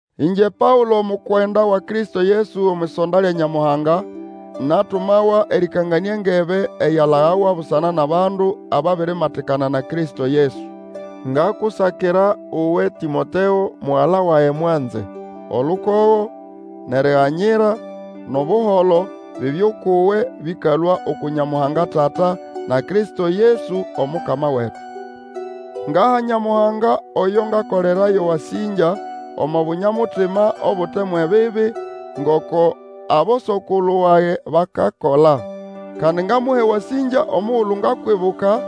Ĩngye Paũlo, omukwenda wa Kristo Yesu omwʼisonda lya Nyamuhanga, natumawa erĩkanganĩa engebe eyalagawa busana nʼabandu ababirimatikana na Kristo Yesu. Ngakusakira uwe Tĩmoteo, mugala wage mwanze: Olukogo, nʼeriganyira, nʼobuholo, bibye ukʼuwe bĩkalũa uku Nyamuhanga Tata, na Kristo Yesu Omukama wetu. Ngaha Nyamuhanga oyo ngakolera yo wasĩngya, omo bunya-mutima obute mwʼebibi, ngoko aboso-kulu wage bakola. Kandi ngamuha ewasĩngya omugulu ngakwibuka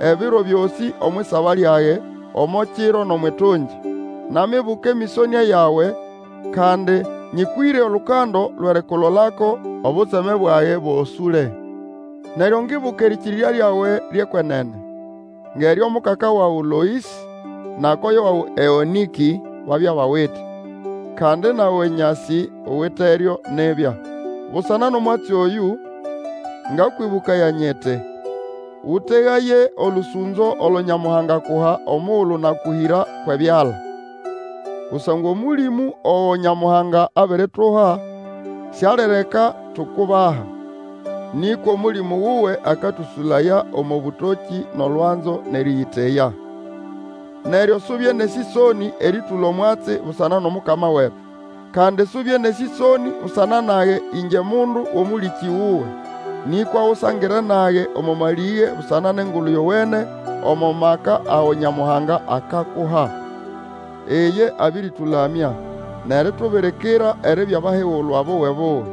ebiro byosĩ omwʼisaba lyage, omo kiro nʼomwʼitungi. Namibuka emĩsonĩa yawe, kandi nyĩkwĩre olukando lwʼerikulolako, obutseme bwage buosũle. Neryo ngibuka erĩkĩrĩrya lyawe lyʼekwenene; ngʼeryo mukaka wawe Loĩsĩ na koyo wawe Eũnĩkĩ babya bawite. Kandi nawe nyasĩ uwiteryo nibya. Busana nʼomwatsi oyũ, Ngakwĩbũkaya nyiti, Ũtegaye olũsũnzo olo Nyamuhanga akuha omugulu nakũhĩra kwʼebyala. Kusangwa Omũlĩmũ ogo Nyamuhanga abirituha Sialireka tukubaha; nĩkwa Omũlĩmũ wuwe akatũsũlaya omo bũtokĩ nʼolwanzo, nʼerĩyĩteya. Neryo subye nʼesĩsonĩ erĩtũla omwatsi busana nʼOmukama wetu; kandi subye nʼesĩsonĩ busana nage ĩngye mundu wʼomũlĩkĩ wuwe. Nĩkwa usangire nage omo malĩge busana nʼEngulu Yowene omo maka ago Nyamuhanga akakuha. Iye abĩrĩtũlamya nʼeritubirikira eribya bahigulwa buwe-buwe.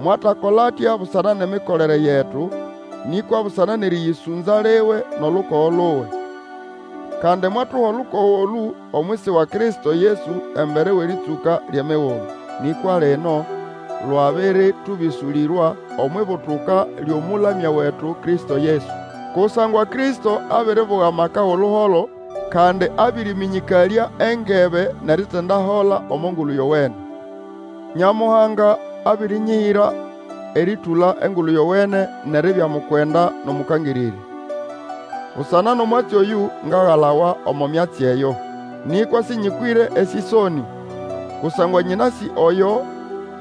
Mwatakola atya busana nʼemikolere yetu, nĩkwa busana nʼerĩyĩsũnza liwe nʼolukogo luwe. Kandi mwatuha olukogo olũ omwisi wa Kristo Yesu embere wʼerĩtsũka lyʼemigulu. Nĩkwa lino lwabĩrĩtũbĩsũlĩrwa omwʼibutuka lyʼOmũlamya wetu Kristo Yesu. Kusangwa Kristo abiribuga amaka wʼoluholo, kandi abĩrĩmĩnyĩkalya engebe nʼeritindahola omo Ngulu Yowene. Nyamuhanga abĩrĩnyĩhĩra erĩtũla Engulu Yowene nʼeribya mukwenda nʼOmũkangĩrĩrya. Busana nʼomwatsi oyũ, ngagalawa omo myatsi eyo. Nĩkwa sĩnyĩkwĩre esĩsonĩ, kusangwa nyĩnasĩ oyo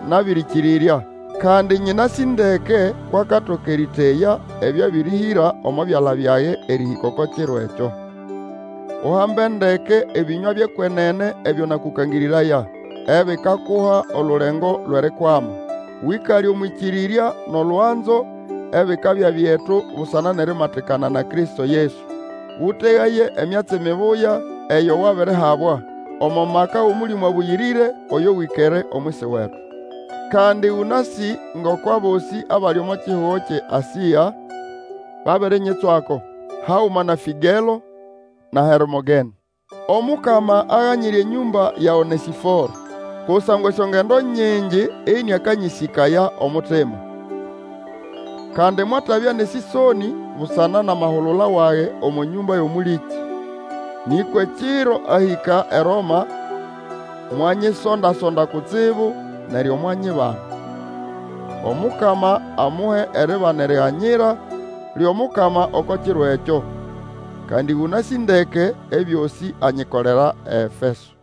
nabĩrĩkĩrĩrya, kandi nyĩnasĩ ndeke kwʼakatoka erĩteya ebyo abĩrĩhĩra omo byala byage erĩhĩka oko kiro ekyo. Uhambe ndeke ebĩnywa byʼekwenene ebyo nakũ kangĩrĩraya, ebikakuha olulengo lwʼerikwama. Wĩkale omwʼĩkĩrĩrya nʼolwanzo ebikabya byetu busana nʼerimatikana na Kristo Yesu. Ũtegaye emyatsi mibuya eyo wabirihabwa, omo maka wʼOmũlĩmũ Abũyĩrĩre oyo wĩkere omwisi wetu. Kandi ũnasĩ ngoko abosĩ abali omo kihugo kyʼeAsĩa babirinyitswako, haguma na Fĩgelo na Hermogene. Omukama aganyire enyũmba ya Onesĩforo, kusangwa esyongendo nyingi ĩnĩakanyĩsĩkaya omutima. Kandi mwatabya nʼesĩsonĩ busana nʼamahulula wage omo nyũmba yʼomũlĩkĩ. Nĩkwa ekiro ahĩka eRoma mwanyisonda-sonda kutsibu, neryo mwanyibana. Omukama amuhe eribana eriganyira lyʼomukama oko kiro ekyo. Kandi ũnasĩ ndeke ebyosĩ anyikolera eEfeso.